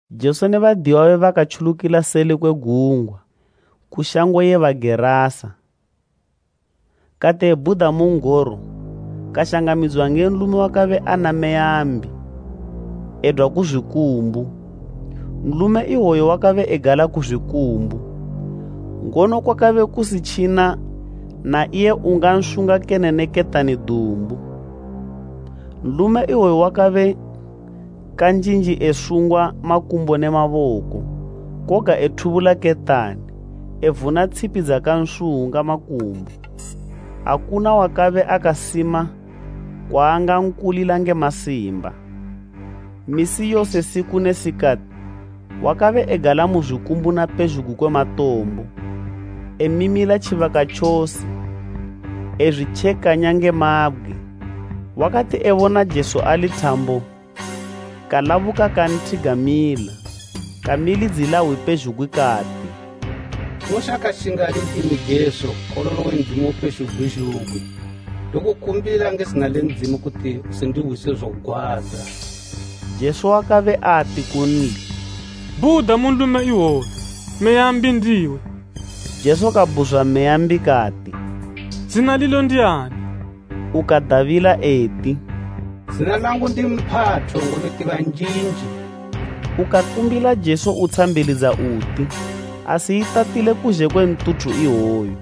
Jesu ne badiyiwa babe bakatjulukila seli kwe gungwa ku shango ye Bagerasa. Kati ebhuda mu n'goro, kashangamidziwa nge nlume wakabe ana meya mbi, edwa ku zwikumbu. Nlume iwoyo wakabe egala ku zwikumbu, ngono kwakabe kusitjina na iye ungansunga kene nge ketani dumbu. Nlume iwoyo wakabe kanjinji esungwa makumbo ne maboko, koga ethubula ketani, evuna tshipi dzakansunga makumbo. Akuna wakabe akasima kwaangankulila nge masimba. Misi yose siku ne sikati wakabe egala mu zwikumbu na pezhugwi kwe matombo, emimila tjibaka tjose ezwitjekanya nge mabgwe. Wakati ebona Jesu ali thambo kalabuka kanthigamila. Kamilidzila hwi pezhugwi kati, “Unoshakashingani ndimi Jesu, Nkololo we Ndzimu Upezhugwi zhugwi? Ndokumbila nge zina le Ndzimu kuti usindihwise zogwadza.” Jesu wakabe ati kunli, “Bhuda mu nlume iwoyu, meya mbi ndiwe!” Jesu kabhuzwa meya mbi kati, “Zina lilo ndiani?” Kadabila eti, “Zina langu ndi Mphatho, ngobe tibanjinji.” Ukakumbila Jesu utshambilidza uti, asiyitatile kuzhe kwe ntuthu iwoyo.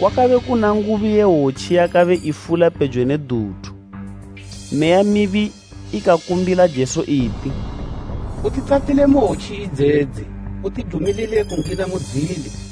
Kwakabe kuna ngubi ye hwotji yakabe ifula pejo ne duthu. Meya mibi ikakumbila Jesu iti, “Utitatile mu hwotji idzedzi, utidumilile kungina mudzili.”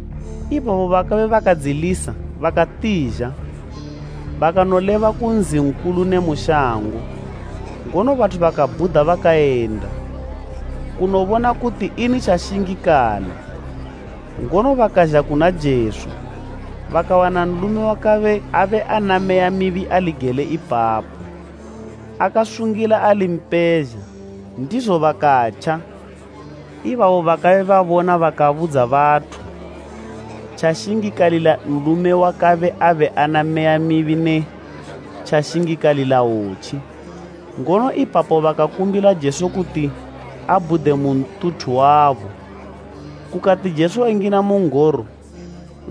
Ibabo bakabe bakadzilisa bakatizha, bakanoleba ku nzi nkulu ne mu shango, ngono bathu bakabhuda bakayenda kunobona kuti ini tjashingikala. Ngono bakazha kuna Jesu, bakawana nlume wakabe abe ana meya mibi ali gele ipapo, akasungila ali mpezha, ndizo bakatja. Ibabo bakabe babona bakabudza bathu tjashingikalila nlume wakabe abe ana meya mibi ne tjashingikalila hwotji. Ngono ipapo bakakumbila Jesu kuti abhude mu ntuthu wabo. Kukati Jesu engina mu n'goro,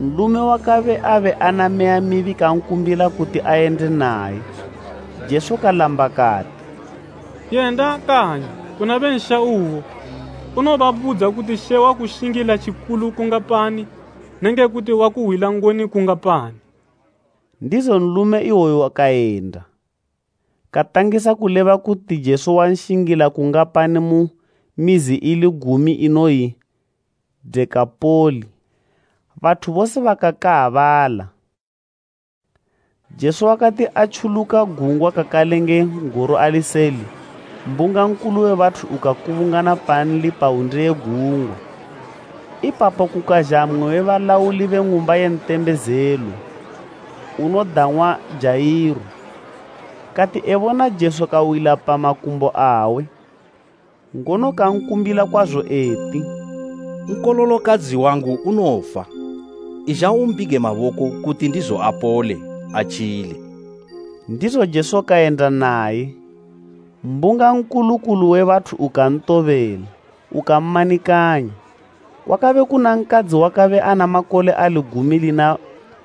nlume wakabe abe ana meya mibi kankumbila kuti ayende naye. Jesu kalamba kati, “Yenda kanyi kuna be nsha uwo unobabudza kuti She wakushingila tjikulu kungapani nenge kuti wakuhwila ngoni kungapani.” Ndizo nlume iwoyo kayenda, katangisa kuleba kuti Jesu wanshingila kungapani mu mizi ili gumi inoyi Dekapoli. Bathu bose bakakaabala. Jesu wakati atjuluka gungwa kakale nge n'goro ali seli, mbunga nkulu we bathu ukakubungana panli pa wunde ye gungwa. Ipapo kukazha mmwe we balauli be Ng'umba ye Ntembezelo unodang'wa Jairo. Kati ebona Jesu kawila pa makumbo awe, ngono kankumbila kwazo eti, “Nkololokadzi wangu unofa. Izha umbige maboko kuti ndizo apole, atjile.” Ndizo Jesu kayenda naye. Mbunga nkulu kulu we bathu ukantobela ukammanikanya. Kwakabe kuna nkadzi wakabe ana makole ali gumi lina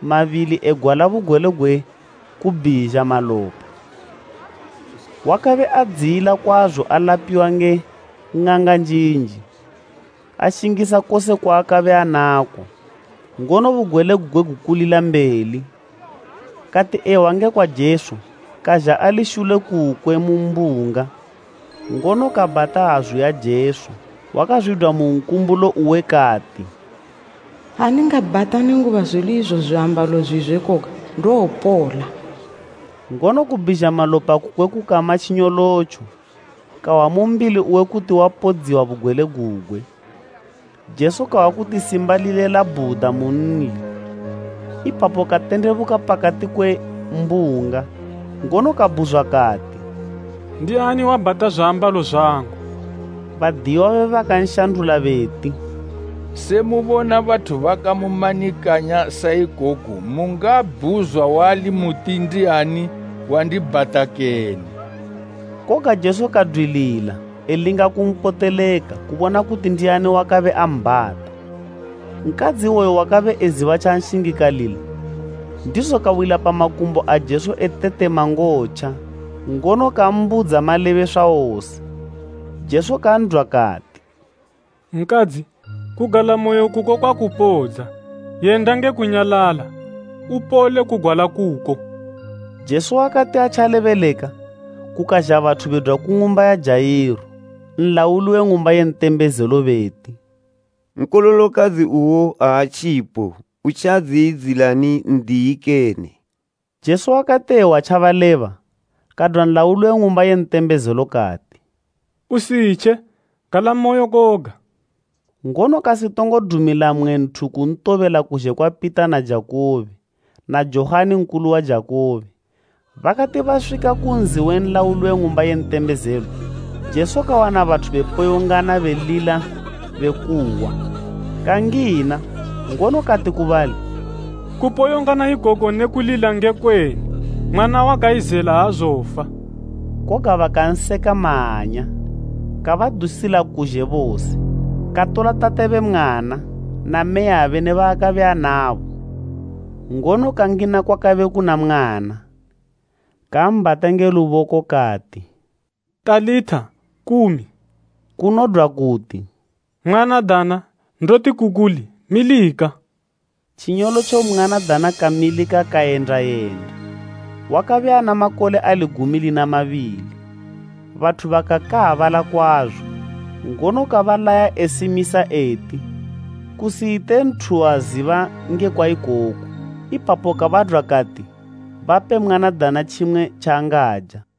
mabili egwala bugwele gwe kubhizha malopa. Wakabe adziyila kwazo alapiwa nge ng'anga njinji, ashingisa kose kwaakabe anako, ngono bugwele gugwe gukulila mbeli. Kati ehwa ngekwa Jesu kazha ali shule kukwe mu mbunga, ngono kabhata hazu ya Jesu. Wakazwidwa mu nkumbulo uwe kati, “Ha ndingabhata nenguba zwili izo zwiambalo zwizwe koga, ndowopola!” Ngono kubhizha malopa kukwe kukama tjinyolotjo, kahwa mu mbili uwe kuti wapodziwa bugwele gugwe. Jesu kahwa kuti simba lile labhuda munli, ipapo katendebuka pakati kwe mbunga, ngono kabhuzwa kati, “Ndiani wabhata zwiambalo zwangu?” Badiyiwa babe bakanshandula beti, “Se mubona bathu bakamumanikanya saikoku mungabhuzwa wali muti, ‘Ndiani wandibhata kene?’” Koga Jesu kadwilila elinga kumpoteleka kubona kuti ndiani wakabe ambhata. Nkadzi iwoyo wakabe eziba tjanshingikalila, ndizo kawila pa makumbo a Jesu etetema ngotja, ngono kambudza malebeswa wose. Jesu kan'dwa kati, “Nkadzi, kugalamoyo kuko kwakupodza. Yenda nge kunyalala, upole kugwala kuko.” Jesu wakati atjalebeleka, kukazha bathu bedwa ku ng'umba ya Jairo, nlauli we ng'umba ye ntembezelo beti, “Nkololokadzi uwo aatjipo. Utjadziyidzilani N'diyi kene?” Jesu wakati ehwa tjabaleba, kadwa nlauli we ng'umba ye ntembezelo kati, “Usitje, galamoyo koga.” Ngono kasitongo dumila mmwe nthu kuntobela kuzhe kwa Pita na Jakubo na Johani nkulu wa Jakubo. Bakati baswika ku nzi we nlauli we ng'umba ye mitembezelo, Jesu kawana bathu be poyongana belila bekuwa. Kangina, ngono kati ku bali, “Kupoyongana ikoku ne kulila ngekweni? Mwana wakayizela aazofa.” Koga bakanseka mahanya. Kabadusila kuzhe bose, katola tate be mwana na mmeyabe ne baakabe anabo, ngono kangina kwakabe kuna mwana. Kambhata nge luboko kati, “Talitha, kumi,” kunodwa kuti, “Mwanadana, ndoti ku kuli, milika.” Tjinyolotjo mwanadana kamilika kayenda yenda. Wakabe ana makole ali gumi lina mabili. Bathu bakakaabala kwazo. Ngono kabalaya esimisa eti kusiyite nthu waziba ngekwa ikoku, ipapo kabadwa kati bape mwanadana tjimwe tjaangaja.